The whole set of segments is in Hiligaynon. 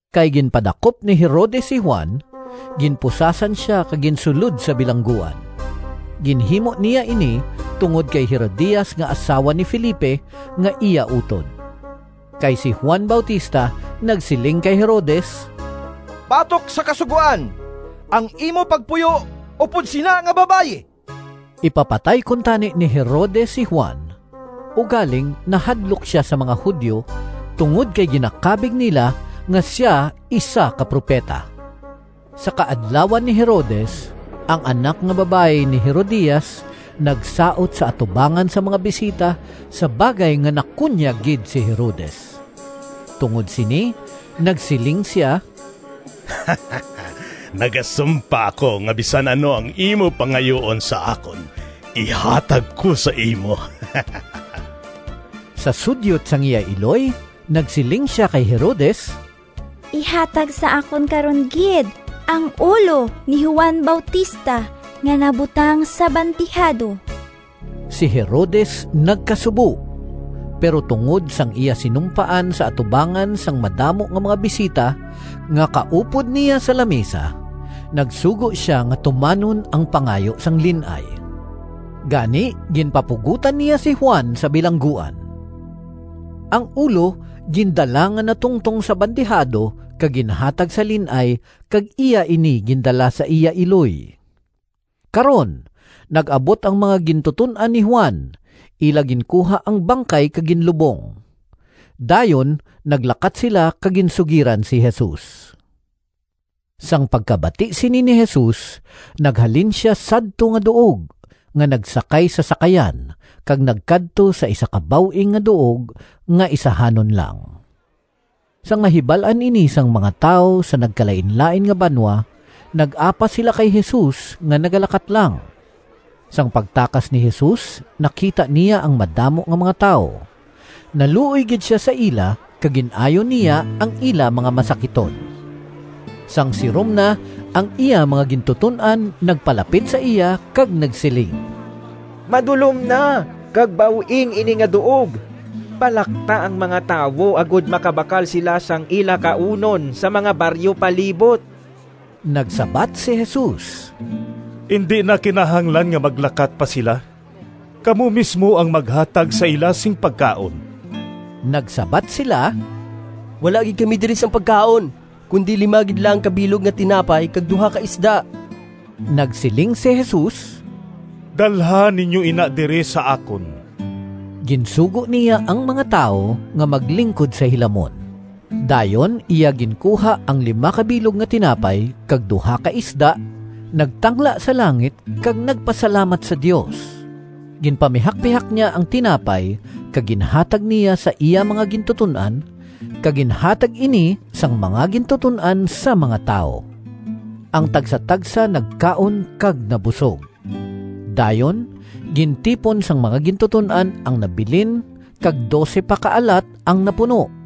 Kay ginpadakop ni Herodes si Juan, ginpusasan sia kag ginsulod sa bilangguan. Ginhimo niya ini tungod kay Herodias nga asawa ni Felipe nga iya utod. Kay si Juan Bautista nagsiling kay Herodes, “Batok sa kasugoan ang imo pagpuyo upod sina nga babayi!” Ipapatay kuntani ni Herodes si Juan, ugaling nahadlok sia sa mga Judio tungod kay ginakabig nila nga sia isa ka propeta. Sa kaadlawan ni Herodes, ang anak nga babayi ni Herodias nagsaot sa atubangan sang mga bisita sa bagay nga nakunyag gid si Herodes. Tungod sini nagsiling sia, “Nagasumpa ako nga bisan ano ang imo pangayuon sa akon ihatag ko sa imo!” Sa sudyot sang iya iloy nagsiling sia kay Herodes, “Ihatag sa akon karon gid ang ulo ni Juan Bautista nga nabutang sa bandihado!” Si Herodes nagkasubo, pero tungod sang iya sinumpaan sa atubangan sang madamo nga mga bisita nga kaupod niya sa lamisa nagsugo sia nga tumanon ang pangayo sang lin-ay. Gani ginpapugotan niya si Juan sa bilangguan. Ang ulo gindala nga natungtong sa bandihado kag ginhatag sa lin-ay kag iya ini gindala sa iya iloy. Karon nag-abot ang mga gintuton-an ni Juan, ila ginkuha ang bangkay kag ginlubong. Dayon naglakat sila kag ginsugiran si Jesus. Sang pagkabati sini ni Jesus, naghalin sia sadto nga duog nga nagsakay sa sakayan kag nagkadto sa isa ka baw-ing nga duog nga isahanon lang. Sang nahibal-an ini sang mga tawo sa nagkalainlain nga banwa, nag-apas sila kay Jesus nga nagalakat lang. Sang pagtakas ni Jesus, nakita niya ang madamo nga mga tawo. Naluoy gid sia sa ila kag gin-ayo niya ang ila mga masakiton. Sang sirom na, ang iya mga gintuton-an nagpalapit sa iya kag nagsiling, “Madulom na kag baw-ing ini nga duog. Palakta ang mga tawo agod makabakal sila sang ila kaunon sa mga baryo palibot.” Nagsabat si Jesus, “Indi na kinahanglan nga maglakat pa sila. Kamo mismo ang maghatag sa ila sing pagkaon.” Nagsabat sila, “Wala gid kami diri sing pagkaon, kundi lima gid lang ka bilog nga tinapay kag duha ka isda.” Nagsiling si Jesus, “Dalha ninyo ina diri sa akon.” Ginsugo niya ang mga tawo nga maglingkod sa hilamon. Dayon iya ginkuha ang lima ka bilog nga tinapay kag duha ka isda, nagtangla sa langit kag nagpasalamat sa Dios. Ginpamihakpihak niya ang tinapay kag ginhatag niya sa iya mga gintuton-an, kag ginhatag ini sang mga gintuton-an sa mga tawo. Ang tagsatagsa nagkaon kag nabusog. Dayon gintipon sang mga gintuton-an ang nabilin kag dose pa ka alat ang napuno.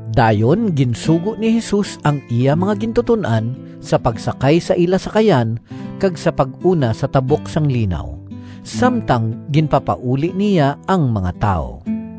Dayon ginsugo ni Jesus ang iya mga gintuton-an sa pagsakay sa ila sakayan kag sa pag-una sa tabok sang linaw, samtang ginpapauli niya ang mga tawo.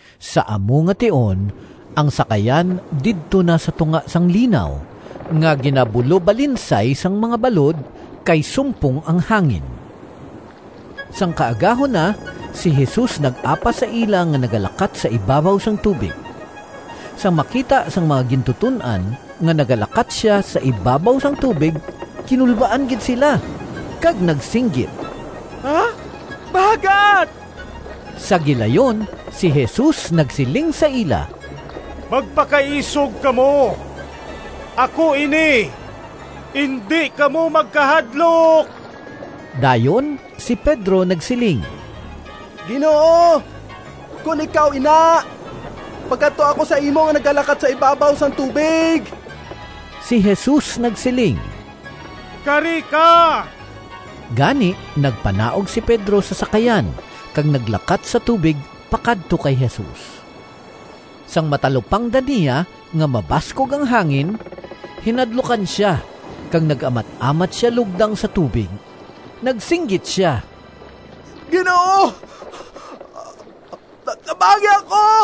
Sa amo nga tion, ang sakayan didto na sa tunga sang linaw nga ginabulobalinsay sang mga balod, kay sumpong ang hangin. Sang kaagahon na, si Jesus nag-apas sa ila nga nagalakat sa ibabaw sang tubig. Sang makita sang mga gintuton-an nga nagalakat sia sa ibabaw sang tubig, kinulbaan gid sila kag nagsinggit, “Bagat!” Sa gilayon si Jesus nagsiling sa ila, “Magpakaisog kamo! Ako ini. Indi kamo magkahadlok!” Dayon si Pedro nagsiling, “Ginoo, kon ikaw ina, pakadtoa ako sa imo nga nagalakat sa ibabaw sang tubig.” Si Jesus nagsiling, “Kari ka!” Gani nagpanaog si Pedro sa sakayan kag naglakat sa tubig pakadto kay Jesus. Sang matalupangdan niya nga mabaskog ang hangin, hinadlukan sia kag nag-amat-amat sia lugdang sa tubig. Nagsinggit sia, “Ginoo, tabangi ako!”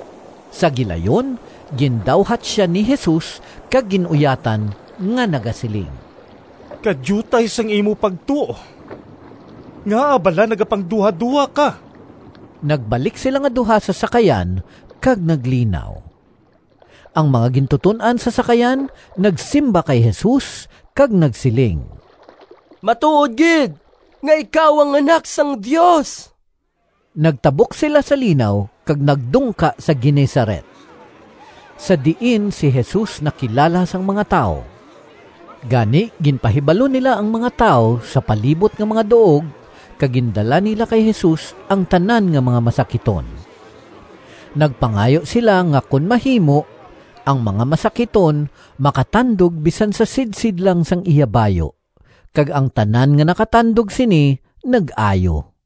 Sa gilayon gindawhat sia ni Jesus kag gin-uyatan nga nagasiling, “Kadiutay sang imo pagtuo! Ngaa bala nagapangduhadoha ka?” Nagbalik sila nga duha sa sakayan, kag naglinaw. Ang mga gintuton-an sa sakayan nagsimba kay Jesus kag nagsiling, “Matuod gid nga ikaw ang Anak sang Dios!” Nagtabok sila sa linaw kag nagdungka sa Genezaret, sa diin si Jesus nakilala sang mga tawo. Gani ginpahibalo nila ang mga tawo sa palibot nga mga duog, kag gindala nila kay Jesus ang tanan nga mga masakiton. Nagpangayo sila nga kon mahimo ang mga masakiton makatandog bisan sa sidsid lang sang iya bayu, kag ang tanan nga nakatandog sini nag-ayo.